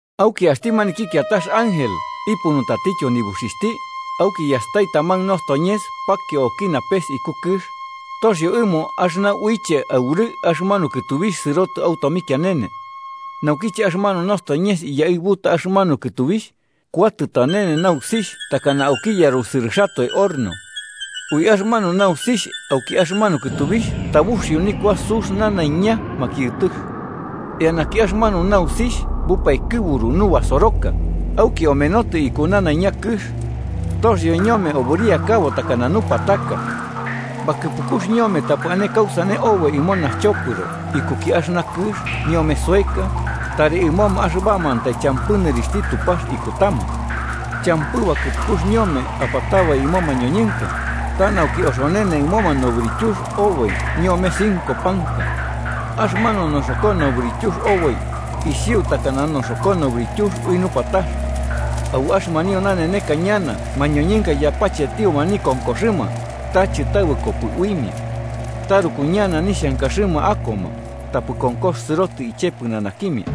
Auki axti maniki kiatax ángel ipunutatityo nibuxixhti, auki yastai taman nostoñes pakio auki napes iku kɨx, toxio ɨmo axɨna uiche aurɨ'ɨ axɨmanu kɨtubixh sɨrotɨ au tomikianene. Naukiche axɨmanu nostoñes iyaɨbuta axɨmanu kɨtubixh, kuatɨ tanene nausixh takana auki yarusɨrɨxatoe horno. Ui axɨmanu nausixh auki axɨmanu kɨtubixh tabuxio nikua sux nanaiña makiɨtɨx. Eanaki axɨmanu nausixh bupaikɨburu nubasoroka auki omenotɨ iku nanaiña kɨx. Toxio ñome obɨriakabo takana nupataka. Bakɨpukux ñome tapɨ ane kausane oboi ɨmo naxchopɨro ikuki axɨna kɨx ñome soeka, tari ɨmoma axɨbamantai champɨ nɨrixhti Tupax ikutama. Champɨ bakɨpukux ñome apatabai ɨmo mañoñɨnka, ta nauki oxonene ɨmoma nobɨrityux oboi ñome cinco panka. Axɨmanu noxoko nobɨrityux oboi isiu takana noxoko nobɨrityux ui nupatax. Au axɨmanio naneneka ñana mañoñɨnka yapachetioma nikonkoxɨma, ta chɨtabɨkopɨ uimia. Taruku ñana nixhankaxɨma akoma, tapɨ konkox sɨrotɨ iche pɨnanakimia.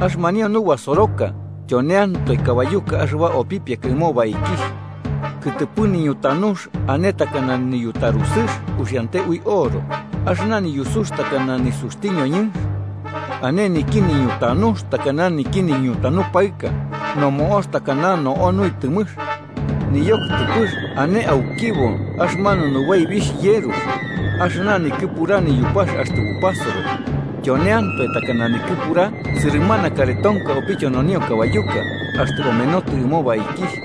Axɨmanio nubasoroka tyoneantoe kabayuka axɨba opipiaka ɨmo baikixh. Kɨtɨpɨ niñutanux ane takana niyutarusɨx uxiante ui oro, axɨna niyusux takana nisuxti ñoñɨnx. Ane niki niñutanux takana niki nityanu paɨx, nomo'ox takana no'o nuitɨmɨx. Niyokɨtɨpɨx ane aukibo axɨmanu nubaibixh yerux, axɨna nikɨpura niyupax axtɨ bupasoro, tyoneantoe takana nikɨpura sɨrɨmana karetonka opityononio kabayuka axtɨ omenotɨ ɨmo baikixh.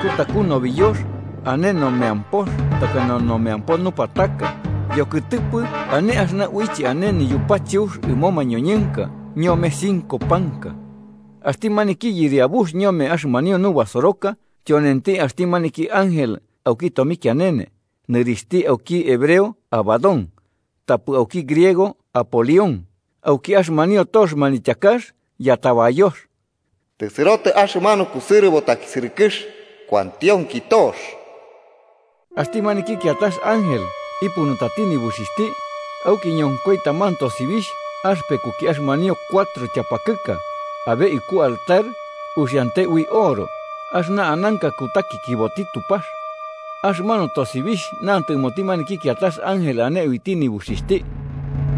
Kutaku nobiyox ane nomeampox takana nomeampo nupataka, yokɨtɨpɨ ane axɨna uiche ane niyupacheux ɨmo mañoñɨnka ñome cinco panka. Axti maniki yɨriabux ñome axɨmanio nubasoroka, tyonenti axti maniki ángel auki tomikianene, nɨrixhti auki hebreo Abadón, tapɨ auki griego Apolión, auki axɨmanio tox manityakax yatabayox. Tɨsɨrotɨ axɨmanu kusɨrɨbo takisɨrɨkɨx. Kuantionki tox. Axti maniki kiatax ángel ipunutati nibuxixhti, auki ñonkoi taman tosibixh axɨpekuki axɨmanio cuatro tyapakɨka abe iku altar uxiante ui oro axɨna ananka kutakikiboti Tupax. Axɨmanu tosibixh nantɨ ɨmoti maniki kiatax ángel, ane uiti nibuxixhti: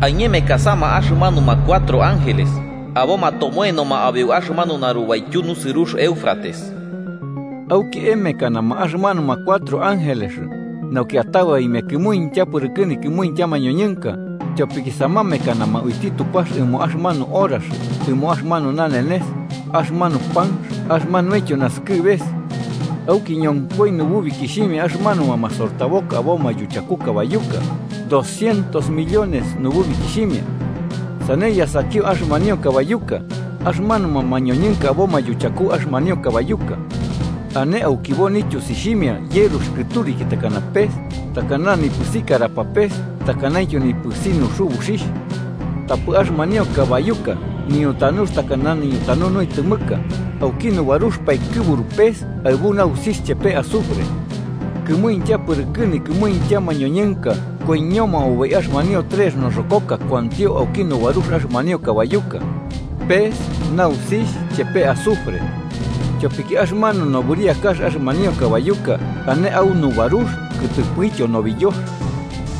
“Aiñemekasama axɨmanuma cuatro ángeles aboma tomoenoma abeu axɨmanu narubaityu nusɨrux Éufrates.” Auki emekanama axɨmanuma cuatro ángeles, nauki atabaimia kɨmuintya pɨrɨkɨ nikɨmuintya mañoñɨnka, tyopiki samamekanama uiti Tupax ɨmo axɨmanu horax ɨmo axɨmanu nanenes, axɨmanu panx axɨmanuintyo nasɨkɨbeka. Auki ñonkoi nububikixhimia axɨmanuma masortaboka aboma yuchaku kabayuka: doscientos millones nububikixhimia. Sane yasakio axɨmanio kabayuka, axɨmanuma mañoñɨnka aboma yuchaku axɨmanio kabayuka. Ane aukibo nityusixhimia yerux kɨturiki takana pes, takana nipɨsi karapapes takanaintyo nipɨsi nuxubuxixh. Tapɨ axɨmanio kabayuka niñutanux takana niñutanu nuitɨmɨka, auki nubarux paikɨburu pes aɨbu nausixh chepe azufre. Kɨmuintya pɨrɨkɨ nikɨmuintya mañoñɨnka koiñoma oboi axɨmanio trex noxokoka kuantio auki nubarux axɨmanio kabayuka: pes nausixh chepe azufre. Tyopiki axɨmanu nobɨriakax axɨmanio kabayuka ane au nubarux kɨtɨpɨtyo nobiyox.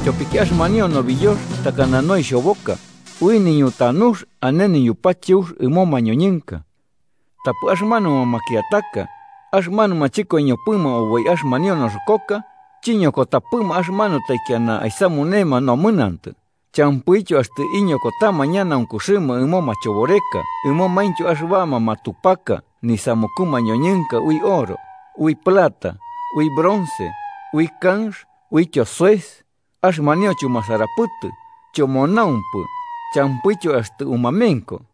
Tyopiki axɨmanio nobiyox takana noixoboka, ui niñutanux ane niyupacheux ɨmo mañoñɨnka. Tapɨ axɨmanuma makiataka, axɨmanuma chɨkoiñopɨma oboi axɨmanio noxokoka, chiñokotapɨma axɨmanu taikiana aisamunema nomɨnantɨ, champɨityo axtɨ iñokotama ñanaunkuxɨma ɨmo machoboreka ɨmomaintyo axɨbama matupaka nisamuku mañoñɨnka ui oro, ui plata, ui bronce, ui kanx uityo soes, axɨmanio chumasarapɨtɨ, chomonaumpɨ champɨityo axtɨ umamenko.